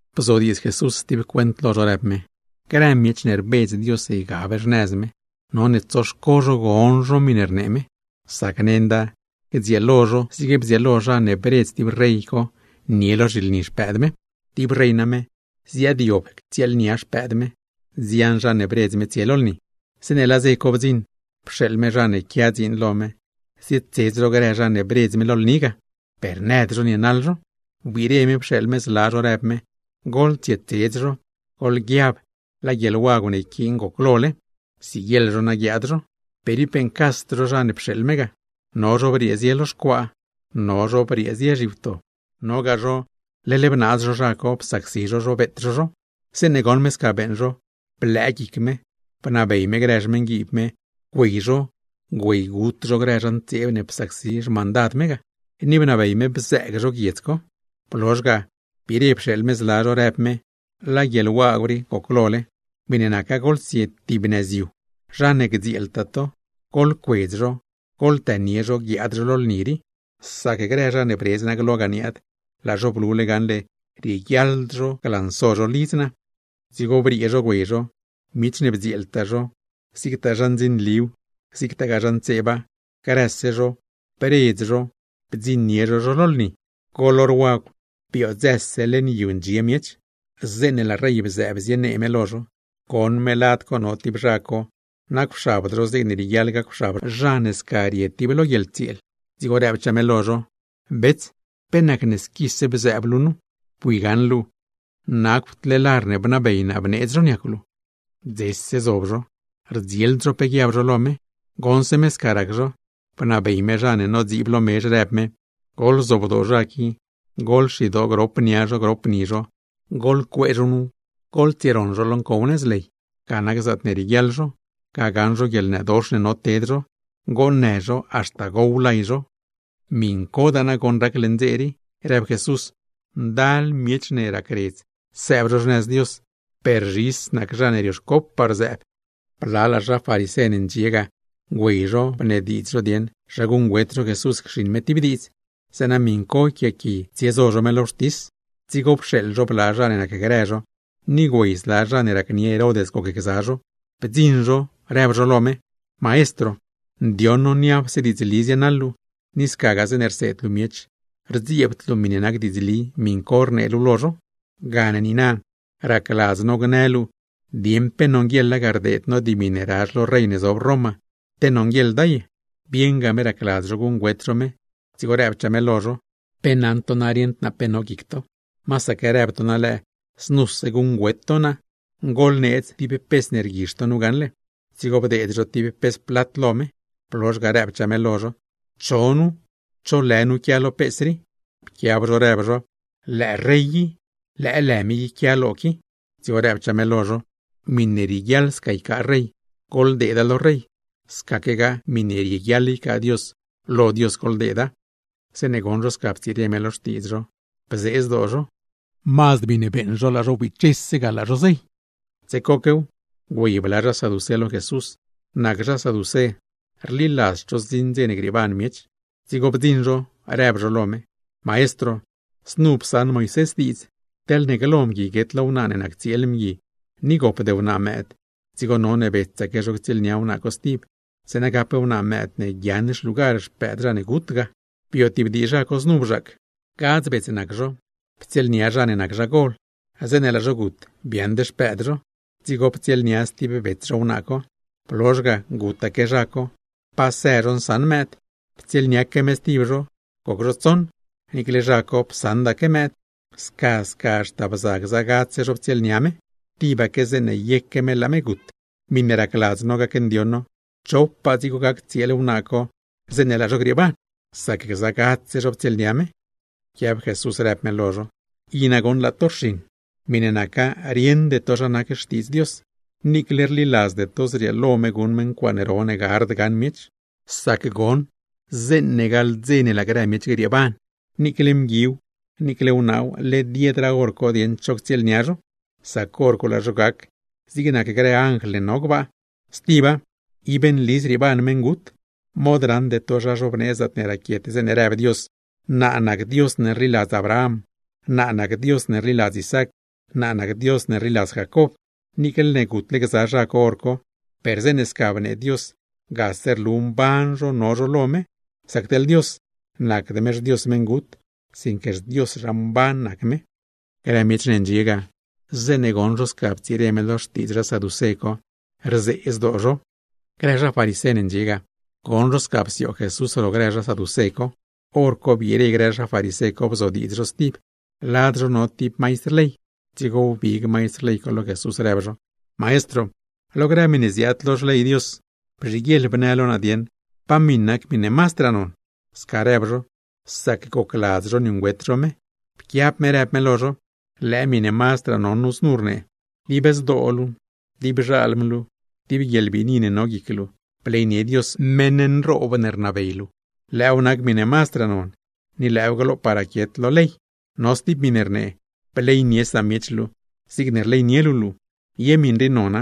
Bzodiidz Jesús stib cuent lo zho, rëb me: ―Grë zha ne rbedz Dios ygab zho xnëz me, none tsoxco zho gon zho miṉe rnee me; sac nenda gdzieelo zho zig bdzieelo zha ne bredz tib rey co nie zho lo zhilni xpëëd me. ’Tib rey name, ziaadyob ctsieelnia xpëëd me, nzian zha ne bredz me tsie lo lni. Zeeṉe laa dze co bdziṉ, pxeeḻ me zha ne quia dziin lo me zietsedz grë zha ne bredz me lo lni ga, per nëd zho nienaḻ zho. Wbiire me pxeeḻ me zla zho rëb me: “Goḻtsietsedz zho, goḻguiab, laa guieḻwagw ne yquiin goclole, siguieḻ zho na guiaad zho.” Per ib beeṉcasd zho zha ne pxeeḻ me ga, no zho briee zie lo xcuaa, no zho briee zie zhiwto, nogaa zho leḻ bnaaz zho zha co, psacsi zho zho, beet zho zho. Zeeṉe goṉ me sca beeṉ zho, blëë me, bnabey me grë xmeṉguiib me güey zho güeygut zho grë zha ntseeb ne psacsi xmandad me ga, ni bnabey me bzëëg zho guiedz co. Blozh ga biire pxeeḻ me zla zho, rëb me: “Laa guieḻwagw rii goclole, miṉe naca goḻtsie tib nëz yu, zha ne gdzieeltaa to, goḻcuedz zho guiaad zho lo lni; sac grë zha ne bredz naa ga niaad, laa zho blule gaṉle rieguiaḻd zho guiaad zho nu.” ’Dzigo briee zho güey zho, miech ne bdzieeltaa zho, zigtaa zha ndzinliw, zigtaa zha ntseeba, grëse zho bredz zho bdziṉnie zho zho lo lni. Goḻ hor wagw, biodzëse leṉ yu ndxie miech. Zeeṉe laa rey bzëëb zienee me lo zho, goṉ me lad co no tib zha co nacwxabd zho zigne rieguiaḻ gacwxab zha ne sca rie tib lo guieḻtsieel. Dzigo rëbchaa me lo zho: “Bets, ¿pe nacne squise luu bzëëb luu nu, bui gaṉle nacwd luu lar ne bneedz zho niacw luu?” ’Dzese zob zho, rdzield zho pe guiab zho lo me. Goṉse me sca rac zho, bnabey me zha ne nodziib lo mezh rëb me: “Goḻzobdoo zha rii, goḻxidoo grop nia zho, grop ni zho, goḻcuee zho nu goḻtsieroṉ zho lo ncow nëz ley. ¡Ga nac zaatne rieguiaḻ zho, ga gaṉ zho guieḻnëdox ne no ted zho, goonnë zho, haxta gow lay zho!” ’Miṉcodaa nagoṉ rac leṉ dze rii ―rëb Jesús―, ndal zha ne racredz sëëb xnëz Dios, per zhis nac zha ne rioxco rzëëb. Blalaa zha farisé ne ndxie ga güey zho bnediidz zho dieṉ zha guṉgüet zho Jesús cxiṉ me tib diidz, zeeṉa miṉ co yquiaaqui tsiezo zho me lo wxtis. Dzigo pxeeḻ zho bla zha ne nacgrë zho, ni güey zla zha ne racnie Herod gocgza zho. Bdziṉ zho rëb zho lo me: ―Maestro, ndioṉ no niapse diidzli zienaḻ luu, ni scagaa zeeṉe rseed luu miech, rdziebd luu miṉe nac diidzli miṉ co rnee luu lo zho. Gane niina, racladz no gnë luu dieṉ pe nonguieḻa ga rdeed no dimi ne razh lo rey ne zob Roma, te nonguieḻda ye. Bieṉga me racladz zho guṉgüet zho me, dzigo rëbchaa me lo zho: ―¿Pe naṉ to na rieṉd naa pe no guic to? Masaque rëb to na lëë, znuse guṉgüet to naa. Goḻneedz tib pes ne rguizh to nu gaṉle. Dzigo bdeed zho tib pes plat lo me. Blozh ga, rëbchaa me lo zho: ―¿Cho nu, cho lë nu quia lo pes rii? Pquiab zho rëb zho: ―Lëë rey i, lëë lë me i quia lo qui. Dzigo rëb me lo zho: ―Miṉe rieguiaḻ sca ycaa rey, goḻdeeda lo rey; scaquegaa miṉe rieguiaḻ ycaa Dios, lo Dios goḻdeeda. Zeeṉe goṉ zho sca ptsire me lo xtiidz zho, bzee zdoo zho, mazd miṉe beeṉ zho laa zho wbichese ga, laa zho zey. Dze coquew, güey bla zha saducé lo Jesús. Nac zha saducé rliladzd zho zdziṉ dze grieeban miech. Dzigo bdziṉ zho, rëb zho lo me: ―Maestro, znu psaṉ Moisés diidz: Teḻne glo mgui guet lo wnaa ne nac tsieel mgui, ni gopd wnaa mëëd, dzigo none betsaque zho ctsieelnia wnaa co stib, zeeṉa gap wnaa mëëd ne guiaaṉ xlugar xpëëd zha ne gut ga. ’Bio tib dii zha co znu bzhaac, gadz bets nac zho. Ptsieelnia zha ne nac zha gol, zeeṉe laa zho gut biaaṉd xpëëd zho. Dzigo ptsieelnia stib bets zho wnaa co. Blozh ga gutaque zha co, pa së zho nsaṉ mëëd. Ptsieelniaque me stib zho, goc zho tsoṉ, niicle zha co psaṉdaque mëëd. Sca sca haxta bza gza gadzse zho ptsieelnia me, tibaque zeeṉe yeque me laa me gut. Miṉe racladz no gacndioṉ no, ¿chopaa dzigo gac tsieel wnaa co zeeṉe laa zho grieeban? Sac gza gadzse zho ptsieelnia me. Pquiab Jesús rëb me lo zho: ―I nagoṉ laa to rxiṉ, miṉe naca rieṉde to zha nac Xtiidz Dios, niicle rliladzde to zrieelo me guṉ me ncuaaṉ ro ne gard gaṉ miech. Sac goṉ zeeṉe gaḻ dze ne laa grë miech grieeban, niicle mguiw niicle wnaaw led yedraa hor co dieṉ cho ctsieelnia zho; sac hor co laa zho gac zig nac grë anjl ne no gbaa. Stiba, ib nli zrieeban meṉgut. Mod raṉde to zha zhobnee zaatne raquiet zeeṉe rëb Dios: “Naa nac Dios ne rliladz Abraham, naa nac Dios ne rliladz Isaac, naa nac Dios ne rliladz Jacob.” Niicle ne gutle gza zha co hor co, per zeeṉe sca bnee Dios gase rlu mban zho no zho lo me; sac teḻ Dios, ¡nacd me xDios meṉgut, sinque xDios zha mban nac me! Grë miech ne ndxie ga, zeeṉe goṉ zho sca ptsire me lo xtiidz zha saducé co, rzee zdoo zho. Grë zha farisé ne ndxie ga, goṉ zho sca psioog Jesús ro grë zha saducé co. Horco biire grë zha farisé co bzodiidz zho stib. Lad zho no tib maistr ley, dzigo wbig maistr ley co lo Jesús, rëb zho: ―Maestro, lo grë xley Dios, bzhiguieḻ bnë lo naa dieṉ, ¿pa miṉ nac miṉe mazdraa non? Sca rëb zho, sac gocladz zho niuṉgüet zho me. Pquiab me rëb me lo zho: ―Lëë miṉe mazdraa non nu znu rnee: “Dib zdoo luu, dib xalm luu, dib guieḻbiini ne no guic luu, bleynie Dios, meṉ nroob ne rnabey luu.” Lëëw nac miṉe mazdraa non, ni lëëw glopaa raquiet lo grëse ley. No stib miṉe rnee: “Bleynie samiech luu zigne rleynie luu luu.” Ye miṉ rii nona,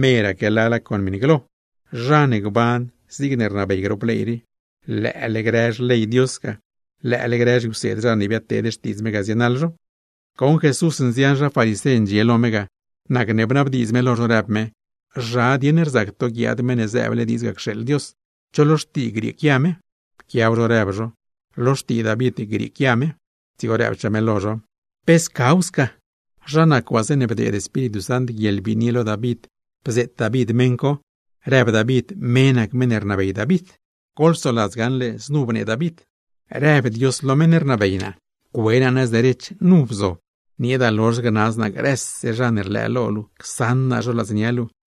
meraque lala con miṉ glo. Zha ne gban zigne rnabey grop ley rii, lëële grë ley ne psaṉ Moisés ga, lëële grë zhiwseed zha ne biadteed xtiidz Dios ga, zienaḻ zho. Goṉ Jesús nzian farisé ndxie lo me ga, nacne bnabdiidz me lo zho rëb me: ―¿Zha dieṉ rzac to guiaad Meṉ ne zëëble diidz ga cxeeḻ Dios? ¿Cho lo xtii grieequia me? Pquiab zho rëb zho: ―Lo xtii David grieequia me. Dzigo rëbchaa me lo zho: ―¿Pe scaw sca? Zha nac waa zeeṉe bdeed Espíritu Sant guieḻbiini lo David bzeet David meṉ co, rëb David me nac meṉ ne rnabey David. Goḻgaṉ gaṉle znu bnee David: Rëb Dios lo meṉ ne rnabey naa: “Cue naa nëz derech, nu bzob, nieeda lozh gnaz naa grëse zha ne rlëë lo luu, csaṉ naa zho ladznia luu.”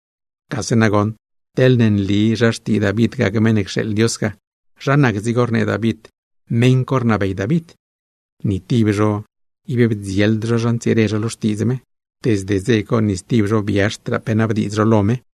Gase nagoṉ teḻne nli zha xtii David gac Meṉ ne cxeeḻ Dios ga, ¿zha nac dzigo rnee David meṉ co rnabey David? Ni tib zho ib bdzield zho zha ntsire zho lo xtiidz me; desde dze co ni stib zho biazhdraa pe nabdiidz zho lo me.